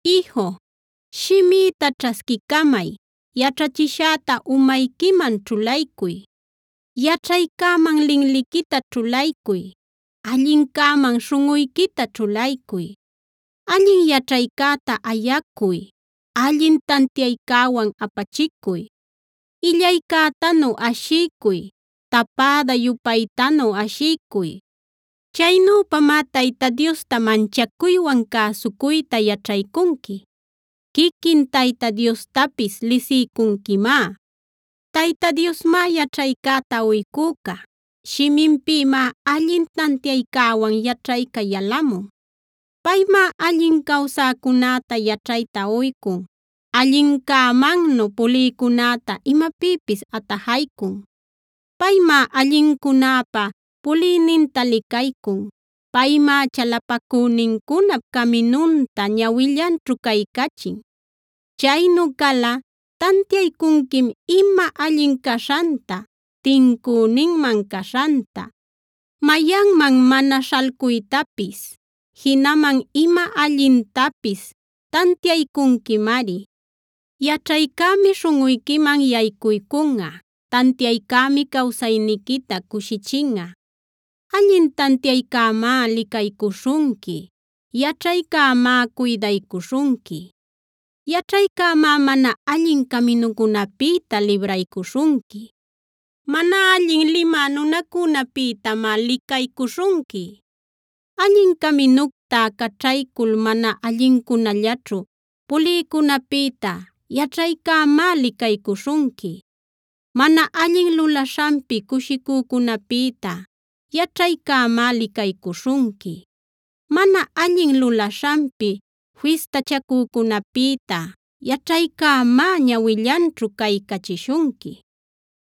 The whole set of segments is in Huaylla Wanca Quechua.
Iju, shimïta ćhasquicamay; yaćhachishäta umayquiman ćhulaycuy. Yaćhaycäman linliquita ćhulaycuy; allincäman śhunꞌuyquita ćhulaycuy. Allin yaćhaycäta ayacuy; allin tantiaycäwan apachicuy. Illaycätanu ashiycuy; tapäda-yupaytanu ashiycuy. Chaynüpamá Tayta Diosta manchacuywan cäsucuyta yaćhaycunqui; quiquin Tayta Diostapis lisiycunquimá. Tayta Diosmá yaćhaycäta uycüca; shiminpïmá allin tantiaycäwan yaćhayca yalamun. Paymá allin cawsäcunäta yaćhayta uycun; allincämannu pulïcunäta imapïpis atajaycun. Paymá allincunäpa puliyninta licaycun; paymá chalapacünincunap caminunta ñawillanćhu caycachin. Chaynu calꞌa tantiaycunquim ima allin caśhanta, tincüninman caśhanta, mayanman mana śhalcuytapis; jinaman ima allintapis taniaycunquimari. Yaćhaycämi śhunꞌuyquiman yaycuycunꞌa; tantiaycämi cawsayniquita cushichinꞌa. Allin tantiaycämá licaycuśhunqui; yaćhaycämá cuydaycuśhunqui. Yaćhaycämá mana allin caminucunapïta libraycuśhunqui; mana allin limä nunacunäpïtamá licaycuśhunqui. Allin caminucta caćhaycul mana allincunallaćhu pulïcunäpïta yaćhaycämá licaycuśhunqui. Mana allin lulaśhanpi cushicücunäpïta yaćhaycämá licaycuśhunqui; mana allin lulaśhanpi fistachacücunäpïta yaćhaycämá ñawillanćhu caycachishunqui.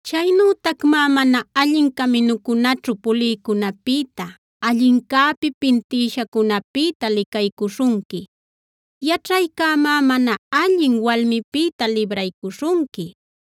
Chaynütacmá mana allin caminucunaćhu pulïcunäpïta, allincäpi pintïshacunäpïta licaycuśhunqui. Yaćhaycämá mana allin walmipïta libraycuśhunqui,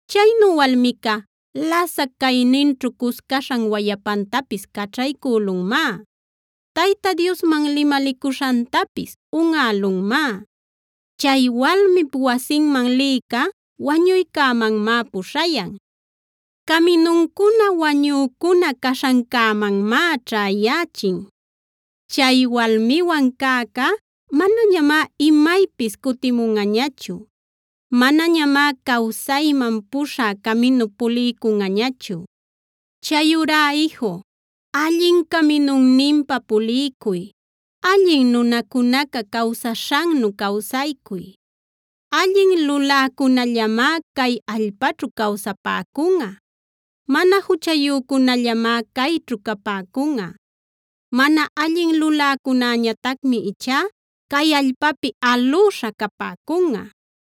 Chaynu walmica lasac cayninćhu cuscaśhan wayapantapis caćhaycülunmá; Tayta Diosman limalicuśhantapis unꞌälunmá. Chay walmip wasinman liyca wañuycämanmá puśhayan; caminuncuna wañücuna caśhancämanmá ćhäyächin. Chay walmiwan cäcá manañamá imaypis cutimunꞌañachu; manañamá cawsayman puśhä caminup puliycunꞌañachu. Chayurá iju, allin caminunninpa puliycuy; allin nunacunaca cawsaśhannu cawsaycuy. Allin luläcunällamá cay allpäćhu cawsapäcunꞌa; mana juchayücunällamá cayćhu capäcunꞌa. Mana allin luläcunäñatacmi ichá cay allpäpi alüśha capäcunꞌa;